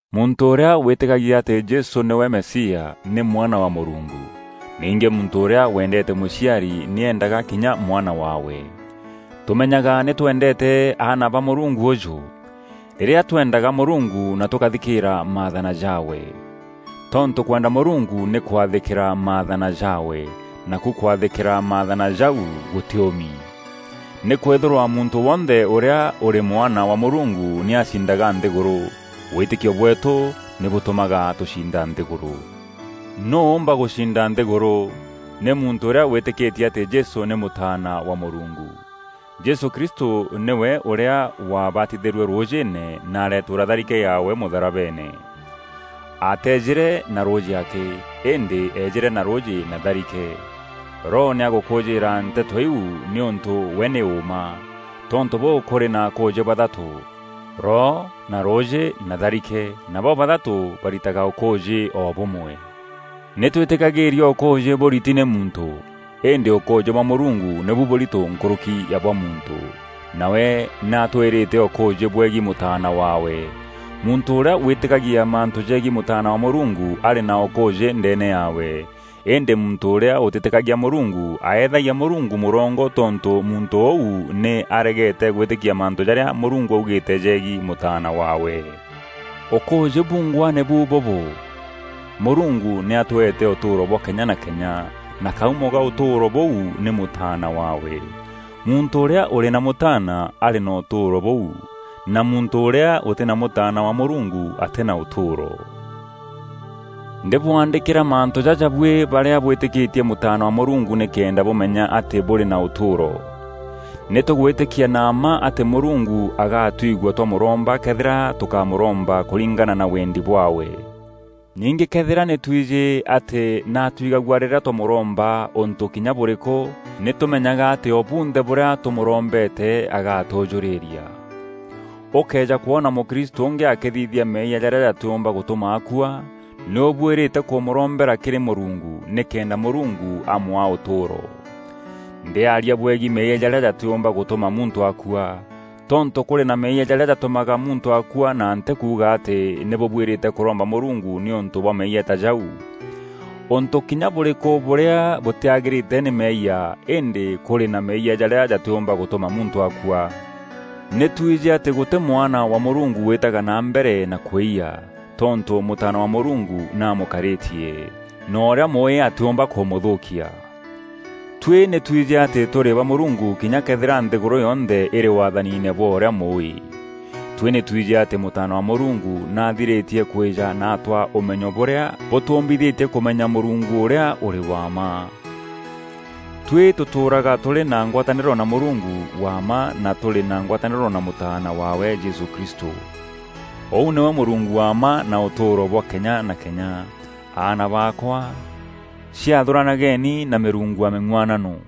Muntû ûrîa wîtîkagia atî Jesû nîwe Mesia, nî mwana wa Mûrungu. Ningî muntû ûrîa wendeete mûciari nî eendaga kinya mwana waawe. Tûmenyaga nî twendeete aana ba Mûrungu ûjû: rîrîa tweendaga Mûrungu na tûkathîkîra maathana jaawe. Tontû kwenda Mûrungu nî kwathîkîra maathana jaawe, naku kwathîkîra maathana jau gûtîûmi. Nîkwîthîrwa muntû wonthe ûrîa ûrî mwana wa Mûrungu nî acindaga nthîgûrû. Wîtîkio bweetû nî bûtûmaga tûcinda nthîgûrû. Nûû ûûmba gûcinda nthîgûrû? Nî muntû ûrîa wîtîkîtie atî Jesû nî Mûtaana wa Mûrungu. Jesû Kristû nîwe ûrîa wabatithîîrue rûûjîîne na areetûûra tharike yaawe mûtharabeene. Ateejîre na rûûjî akî, îndî eejîre na rûûjî na tharike. Roho nî agûkûûjîîra nteto iu nîûntû we nî ûûma. Tontû bûû kûrî na akûûjî bathatû: Roho na rûûjî na tharike, na bo-bathatû baritaga ûkûûjî o bûmwe. Nî twîtîkagîîria ûkûûjî bûriti nî muntû. Îndî ûkûûjî bwa Mûrungu nîbu bûûrito nkûrûki ya bwa muntû, nawe nî atwîrîte ûkûûjî bwegiî Mûtaana waawe. Muntû ûrîa wîtîkagia mantû jegiî Mûtaana wa Mûrungu arî na ûkûûjî ndeene yaawe. Îndî muntû ûrîa ûtîtîkagia Mûrungu, aeethagia Mûrungu mûrongo tontû muntû ûu nî aregeete gwîtîkia mantû jarîa Mûrungu augîîte jegiî Mûtaana waawe. Ûkûûjî bungwa nîbu bûbû: Mûrungu nî atweete ûtûûro bwa kenya na kenya, na kaumo ka ûtûûro bûu nî Mûtaana waawe. Muntû ûrîa ûrî na Mûtaana arî na ûtûûro bûu; na muntû ûrîa ûtî na Mûtaana wa Mûrungu atî na ûtûûro. Ndîbwandîkîra mantû jaja buî barîa bwîtîkîtie Mûtaana wa Mûrungu nîkenda bûmenya atî bûrî na ûtûûro. Nî tûgwîtîkia na mma atî Mûrungu agatwigua twamûromba këethîra tûkamûromba kûringana na wendi bwaawe. Ningî këethîra nî twijî atî nî atwigagua rîrîa twamûromba ûntû kinya bûrîkû; nî tûmenyaga atî o bunthe bûrîa tûmûrombete agatûjûrîria. Ûkëeja kwona mûkristû ûngî akîthithia meeyia jarîa jatîûmba gûtûma akua, nî ûbuîrîte kûmûrombera kîrî Mûrungu, nîkenda Mûrungu amwaa ûtûûro. Ndîaria bwegiî meeyia jarîa jatîûmba gûtûma muntû akua. Tontû kûrî na meeyia jarîa jatûmaga muntû akua na ntî kuuga atî nî bûbuîrîte kûromba Mûrungu nîûntû bwa meeyia ta jau. Ûntû kinya bûrîkû bûrîa bûtîagîrîte nî meeyia, îndî kûrî na meeyia jarîa jatîûmba gûtûma muntû akua. Nî twijî atî gûtî mwana wa Mûrungu wîîtaga na mbere na kwîyia, tontû Mûtaana wa Mûrungu nî amûkarîtie, na ûrîa Mûûî atîûmba kûmûthûûkia. Tuî nî twijî atî tûrî ba Mûrungu kinya këethîra nthîgûrû yonthe îrî waathaniine bwa ûrîa Mûûî. Tuî nî twijî atî Mûtaana wa Mûrungu nî athirîtie kwîja na atwaa ûmenyo bûrîa bûtûûmbithîtie kûmenya Mûrungu ûrîa ûrî wa mma. Tuî tûtûûraga tûrî na ngwatanîro na Mûrungu wa mma na tûrî na ngwatanîro na Mûtaana waawe Jesû Kristû. Ûu nîwe Mûrungu wa mma na ûtûûro bwa kenya na kenya. Aana baakwa, ciathûranageni na mîrungu ya mîng'uanano!